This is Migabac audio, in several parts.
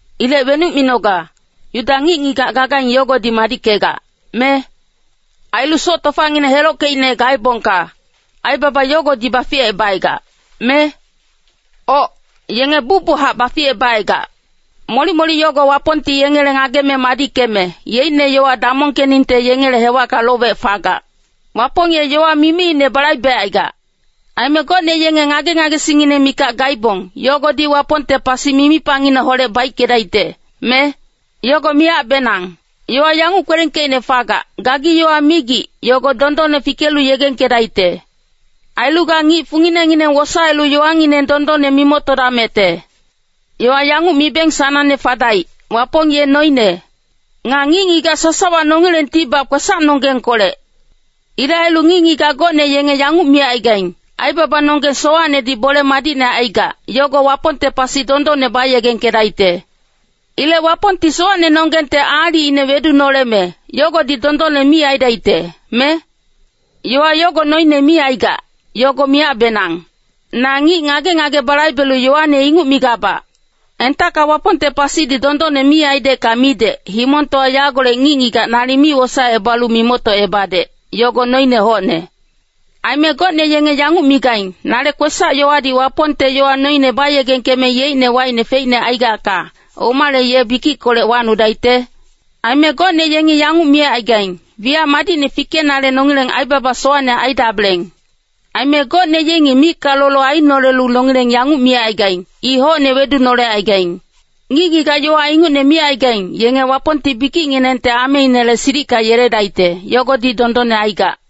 Ilec wenuc minoga, Yuda ngic-ngigac gagaing yogodi madickegac, me? Ailu soc tofangineng helockeicne gaebongka, aibaba yogodi baficebacaigac, me? Oc, yenge bucbuchac baficebacaigac. Molic-molic yogo Wapongti yengele ngageme madickeme, yeicne yowa damongkeningte yengele hewacka lowec fagac. Wapong ye yowa mimiine balaibecaigac. Aime gocne yenge ngage-ngagesingngineng mikac gaibong, yogodi Wapongte pasi mimipangineholec baickedaicte, me? Yogo miyacbenang. Yowa yanguc kwelengkeicne fagac, “Gagi yowa migic, yogo dondonne fikelu yegengkedaicte. Ailu ga ngic funginengineng wosaelu yowangineng dondonne mimoctodamecte.” Yowa yanguc mibeng sanangne fadaic, “Wapong ye noine. Nga ngic-ngigac sasawa nongilengtibac kwesacnonggengkolec.” Ilec ailu ngic-ngigac gocne yanguc micaigaing, “Aibabanonggeng sowacnedi bole madicne aigac, yogo Wapongte pasi dondonne bayegengkedaicte. Ilec Wapongti sowacnenonggengte aalicine wedunoleme, yogodi dondonne mi aidaicte, me?” Yowa yogo noine mi aigac, yogo miyacbenang. Na ngic ngage-ngage balaibelu yowane inguc migabac. Entacka Wapongte pasidi dondonne mi aidecka midec, himongtowa yagolec ngic-ngigac nalic mi wosaecebalu mimoctocebadec, yogo noine hocne. Aime gocne yenge yanguc migaing, “Nale kwesac-yowadi Wapongte yowa noine bayegengkeme yeicne wacine feicne aigacka, omale ye bikickolec wacnudaicte?” Aime gocne yengi yanguc micaigaing, “Wiyac madicne fikenale nongileng aibaba sowacne aidabeleng.” Aime gocne yengi micka lolo ainolelu nongileng yanguc micaigaing, “I hocne wedunolecaigaing.” Ngic-ngigac yowa ingucne micaigaing, yenge Wapongti bikicnginengte ameinele silicka yeledaicte, yogodi dondonne aigac.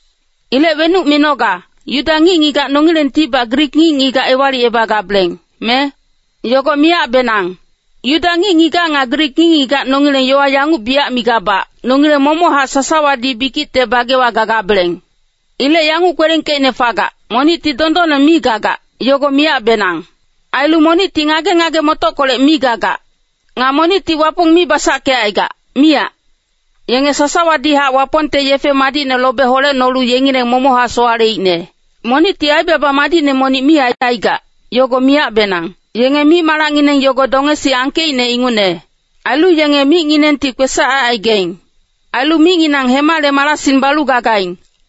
Ilec wenuc minoga, Yuda ngic-ngigac nongilengtibac Grik ngic-ngigac ewalicebagabeleng, me? Yogo miyacbenang. Yuda ngic-ngigac nga Grik ngic-ngigac nongileng yowa yanguc biyac migabac, “Nongileng momochac sasawadi bikicte bagewa gagabeleng.” Ilec yanguc kwelengkeicne fagac, “Monicti dondonne mi gagac, yogo miyacbenang. Ailu monicti ngage-ngage-motockolec mi gagac. Nga monicti Wapong mi basackecaigac, miyac. Yenge sasawadihac Wapongte yefe madicne lobe holecnolu yengileng momochac sowaleicne. Monicti aibaba madicne monic mi aicaigac, yogo miyacbenang.” “Yenge mic-malacngineng yogo dongesi angkeicne ingucne.” “Ailu yenge micnginengti kwesac aicaigaing. Ailu micnginang hemale marasing balu gagaing.”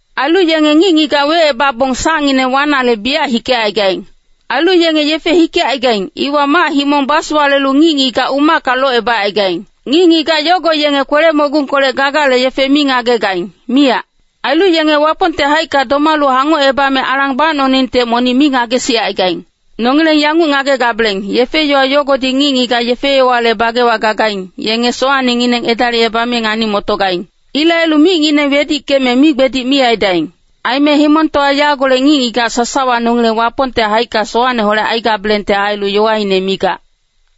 “Ailu yenge ngic-ngigac wecebabong sacngineng wanale biyac hikecaigaing. Ailu yenge yefe hikecaigaing, iwa mac-himong basowalelu ngic-ngigac umacka locebacaigaing. Ngic-ngigac yogo yenge kwele-mogungkolec gagale yefe mi ngagegaing, miyac.” “Ailu yenge Wapongte haicka domalu hangocebame alang bacnoningte monic mi ngagesicaigaing.” Nongileng yanguc ngagegabeleng, yefe-yowa yogodi ngic-ngigac yefe-yowale bagewa gagaing, yenge sowacnengineng edalicebame ngani-motogaing. Ilec ailu micngineng wedickeme migbedic mi aidaing. Aime himongtowa yagolec ngic-ngigac sasawa nongileng Wapongte haicka sowacneholec aigabelengte ailu yowaine migac.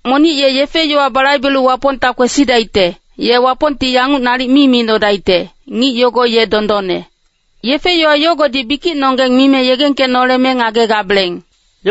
Monic ye yefe-yowa balaibelu Wapongta kwesidaicte, ye Wapongti yanguc nalic mi micnodaicte, “Ngic yogo ye dondonne.” Yefe-yowa yogodi bikicnonggeng mime yegengkenoleme ngagegabeleng.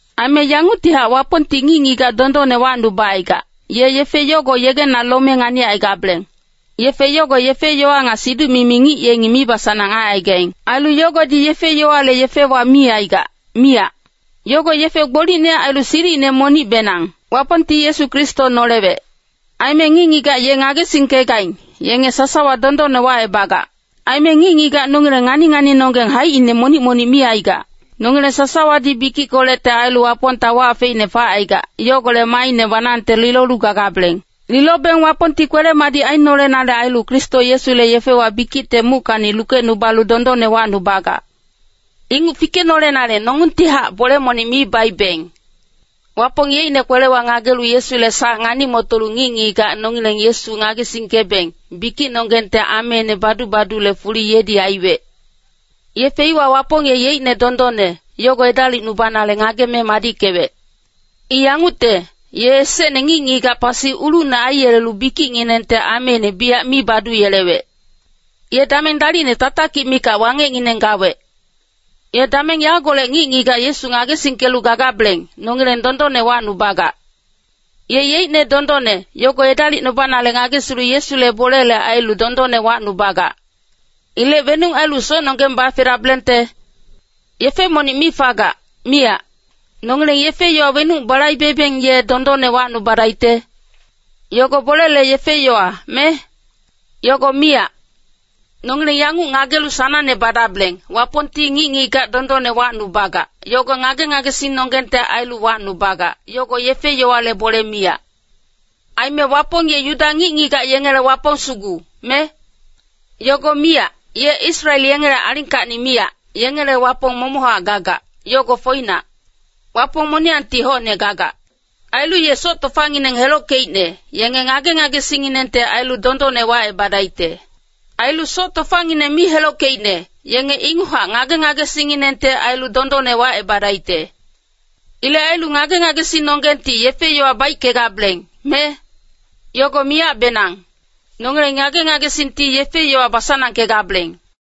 Aime yanguctihac Wapongti ngic-ngigac dondonne wacnubacaigac, ye yefe yogo yegena lome nganicaigabeleng. Yefe yogo yefe-yowa nga siduc-mimi ngic yengi mibasanang aicaigaing. Ailu yogodi yefe-yowale yefewa mi aigac, miyac. Yogo yefe gbolicne ailu silicine monicbenang. Wapongti Yesu Kristo nolewec. Aime ngic-ngigac ye ngagesingkegaing, yenge sasawa dondonne wacebagac. Aime ngic-ngigac nongileng ngani-nganinonggeng haicine monic-monic mi aigac, nongileng sasawadi bikickolecte ailu Wapongta wac feicne facaigac, yogolec maaine banangte lilolu gagabeleng. Lilobeng Wapongti kwele-madic ainolenale ailu Kristo Yesule yefewa bikicte muckacni lukecnubalu dondonne wacnubagac. Inguc fikenolenale nongungtihac bole monic mi baibeng. Wapong yeicne kwelewa ngagelu Yesule sac ngani-motolu ngic-ngigac nongileng Yesu ngagesingkebeng, bikicnonggengte ameine badu-badule fuli yedi aiwec. Yefe iwa Wapong ye yeicne dondonne, yogo edalicnubanale ngageme madickewec. I yangucte, ye esecne ngic-ngigac pasi ulucne aiyelelu bikicnginengte ameine biyac mi baduyelewec, ye dameng dalicne tatakic mikac wangecngineng gawec. Ye dameng yagolec ngic-ngigac Yesu ngagesingkelu gagabeleng, nongileng dondonne wacnubagac. Ye yeicne dondonne, yogo edalicnubanale ngagesilu Yesule bolele ailu dondonne wacnubagac. Ilec wenuc ailu socnonggeng bafedabelengte? Yefe monic mi fagac, miyac. Nongileng yefe-yowa wenuc balaibebeng ye dondonne wacnubadaicte? Yogo bolele yefe-yowa, me? Yogo miyac. Nongileng yanguc ngagelu sanangne badabeleng, Wapongti ngic-ngigac dondonne wacnubagac, yogo ngage-ngagesingnonggengte ailu wacnubagac, yogo yefe-yowale bole miyac. Aime Wapong ye Yuda ngic-ngigac yengele Wapong sugu, me? Yogo miyac, ye Israel yengele alingkacni miyac, yengele Wapong momochac gagac, yogo foinac. Wapong moniyangti hocne gagac. Ailu ye soc tofangineng helockeicne, yenge ngage-ngagesingnginengte ailu dondonne wacebadaicte. Ailu soc tofangineng mi helockeicne, yenge inguchac ngage-ngagesingnginengte ailu dondonne wacebadaicte. Ilec ailu ngage-ngagesingnonggengti yefe-yowa baickegabeleng, me? Yogo miyacbenang. Nongileng ngage-ngagesingti yefe-yowa basanangkegabeleng.